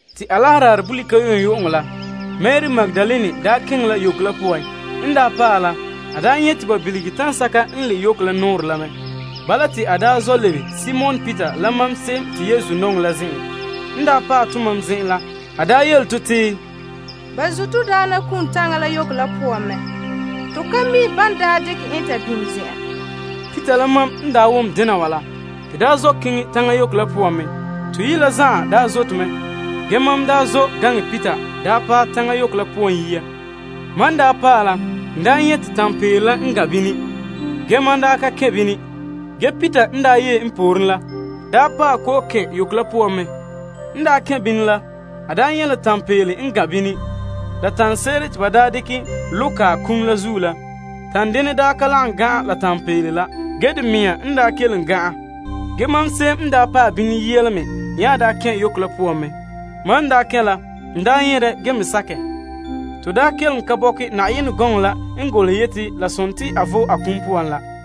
Te Alaherɛ daarɛ bolika yu'uŋyu'uŋɔ la, Mari Magdalene keŋɛ la yoko la poan. En paɛ la, a nyɛ te ba bilige taŋa sɛka n le' yoko la nɔɔrɛn la mɛ. Bala, te a zɔ' lebe Simon Peter la mam se'em te Yesu nɔŋɛ la zen'en. N paɛ tomam zen'en la, a yele to te, Ba zun' to Daana Yesu kum la taŋa la yoko la poan mɛ. To ka mi' ban dekɛ en ta biŋe zen'an. Peter la mam n wom dena wa la, to zɔ' keŋɛ taŋa yoko la poan mɛ. Toyi' la zan'an zote mɛ. Ge, mam daa zɔ' gaŋɛ Peter paɛ taŋa yoko la poan yia. Mam paɛ la, n nyɛ' la tanpeele la n gan' bini. Ge, n ka kɛn' bini. Ge Peter n yee n pooren la paɛ n kɔ'ɔn kɛn' la yoko la poan. N kɛn' bini la, a nyɛ' la tanpeele la n gan' bini la tanɛ se'ere te ba dekɛ lo' kae kum la zuo la. Tandenɛ daa ka lagom gan'an la tanpeele la. Ge, de mea n kelom gan'an. Ge mam, se'em n paɛ bini yia la me nya daa kɛn' yoko la poan mɛ. Mam daa kɛn' la, n nyɛ' dɛ ge me sakɛ. To kelom ka bɔkɛ Yenɛ gɔŋɔ la n golehɛ yeti la sontii a vo'e a kum poan la.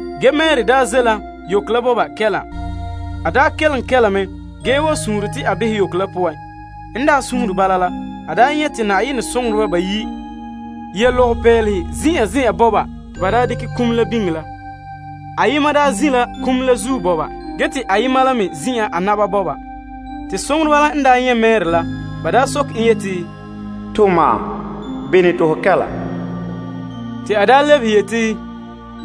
Ge Mari ze' la yoko la bɔba kɛla. A kelom kɛla mɛ ge wa sure te a behɛ yoko la poan. N daa sure bala la, a nyɛ' te Na'ayenɛ soŋoreba bayi' yɛ lɔgɔpeelehe zin'an zen'an bɔba te ba daa dekɛ kum la biŋe la. Ayema daa zin' la kum la zuo bɔba ge te ayema la me zin'an a na'ma bɔba. Te soŋoreba la n nyɛ' Mari la, ba soke en yeti, Pɔka wa, bene te ho kɛla? Te a lebehe yeti,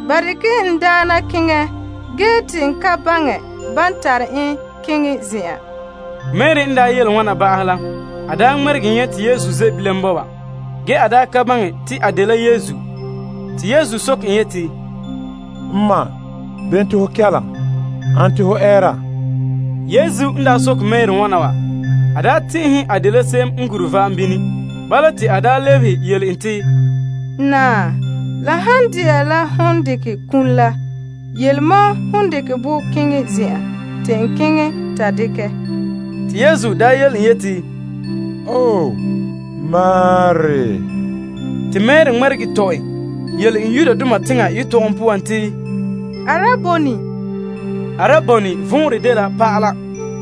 Ba dekɛ la n Daana keŋɛ ge te n ka baŋɛ ban tare en keŋɛ zen'an. Mari n yele wana ba'ahɛ la, a daa ŋmɛregɛ nyɛ' te Yesu ze' bilam bɔba. Ge, a ka baŋɛ te a dela Yesu. Te Yesu soke en yeti, Pɔka wa, bene te ho kɛla? Ane te ho ɛɛra? Yesu n soke Mari wana wa, a tɛn'ɛhɛ te a dela se'em n gure va'am bini. Bala, te a lebehe yele en te, Naa, la han de'a la ho dekɛ kum la, yele mam hon dekɛ bɔ keŋɛ zen'an te n keŋɛ ta dekɛ. Te Yesu yele en yeti, Mari. Te Mari ŋmɛregɛ tɔ' en yele en Aramaik yetɔgɔm poan te, Araboni. Araboni vɔnrɛ dela Pa'ala.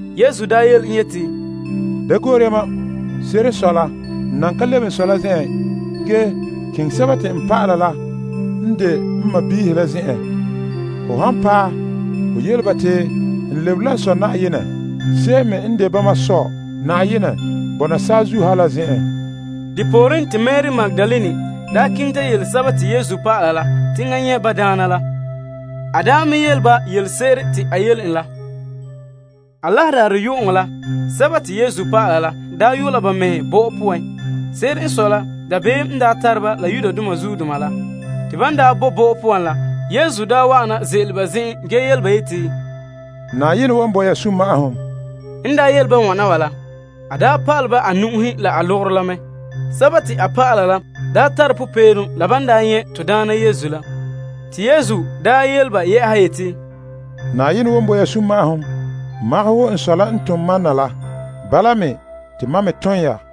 Yesu yele en yeti, Da gorɛ mam. Se'ere n sɔe la, n nan ka lebe n Sɔ la zen'en. Ge, keŋɛ n dɔlɔba la n de n sɔɔnrɔ la zen'en. Ho han paɛ, ho yele ba te n lebere la n Sɔ Na'ayenɛ se'em me n de bama Sɔ Na'ayenɛ bɔna saazuo ha la zen'en. Depooren, te Mari Magdalene keŋɛ ta yele Yesu dɔlɔba la te enŋa nyɛ' ba Daana la. A yele ba yelese'ere te a yele en la. Alaherɛ daarɛ yu'uŋɔ la, Yesu dɔlɔba la yo' la ba mɛhe bɔ'ɔ poan. Se'ere n sɔe la, dabeem n tare ba la Yudoma la. Te ban bo bɔ'ɔ la poan la, Yesu daa wa'ana ze'ele ba zen'en ge yele ba yeti, Na'ayenɛ wan bo ya sunma'ahom. N yele ba wana wa la, a pa'alɛ ba a nu'uhe la a logorɛ la mɛ. A dɔlɔba la tare popeelom la ban nyɛ' to Daana Yesu la. Te Yesu yele ba yɛ'ɛha yeti, Na'ayenɛ wan bo ya sunma'ahom. Magahɛ wo n Sɔ la n tom mam na la, bala me te mam me tom ya.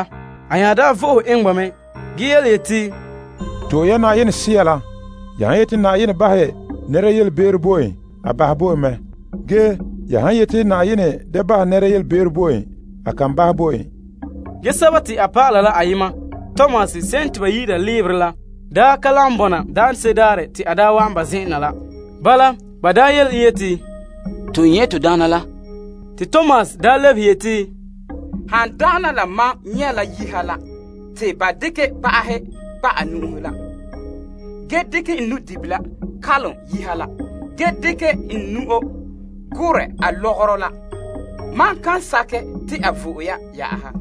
A nya vo'ohe eŋɛ ba mɛ ge yeti, To'e ya Na'ayenɛ Sea la. Ya han yeti Na'ayenɛ bahɛ nɛra yelebe'ero bo en, a bahɛ bo en mɛ. Ge, ya han yeti Na'ayenɛ da bahɛ nɛra yelebe'ero bo en, a kan bahɛ bo en. Ge a dɔlɔba la ayema Tomas se'em te ba yi'ira Leberɛ la, daa ka lagom bɔna daanse'ere daarɛ te a daa wa'an ba zen'en na la. Bala, ba yele en yeti, To nyɛ' to Daana la. Te Tomas lebehe yeti, Han dagana la mam nyɛ' la yiha la te ba dekɛ kpa'ahe kpa' a nu'uhe la, ge dekɛ n nu'dibila kalom yiha la, ge dekɛ n nu'o gorɛ a logorɛ la, mam kan sakɛ te a vo'e ya yɛ'ɛha.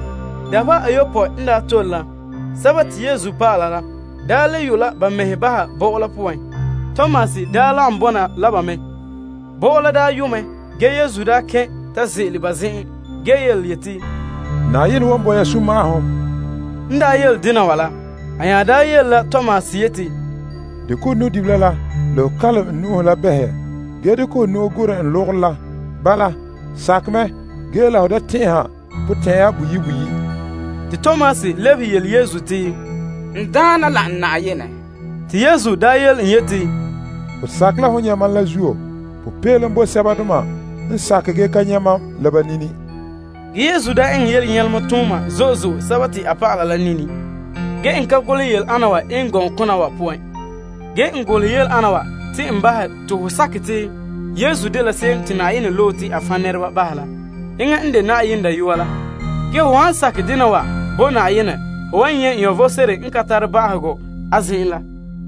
Dabeha ayopɔe n tole la, Yesu dɔlɔba la le yo' la ba mɛhe bɔ'ɔ la poan. Tomas daa lagom bɔna la ba mɛ. Bɔ'ɔ la daa yo' mɛ, ge Yesu daa kɛn' ta ze'ele ba zen'en ge yeti, Na'ayenɛ wan bo ya sunma'ahom. En yele dena wa la, a nya yele la Tomas yeti, Dekɛ ho nu'dibila la la ho kalom n nu'uhe la behɛ ge dekɛ ho nu'o gorɛ n logorɛ la. Bala, sakɛ mɛ ge la ho da tɛn'ɛha potɛn'ɛra boyi' boyi'. Te Tomas lebehe yele Yesu te, N Daana la n Na'ayenɛ. Te Yesu yele en yeti, Ho sakɛ la hon nyɛ' mam la zuo? Popeelom bo sɛbadoma n sakɛ ge ka nyɛ mam la ba nini. Ge Yesu eŋɛ yelenyalema tooma zo'e zo'e a dɔlɔba la nini. Ge, n ka golehɛ yele ana wa eŋɛ gɔŋkona wa poan. Ge n golehɛ yele ana wa te n bahɛ te ho sakɛ te Yesu dela se'em te Yenɛ loe la. Enŋa n de Na'ayenɛ Dayɔa la. Ge ho han sakɛ dena wa bo Na'ayenɛ, ho wan nyɛ' vom sebo n ka tare ba'ahegɔ a zen'en la.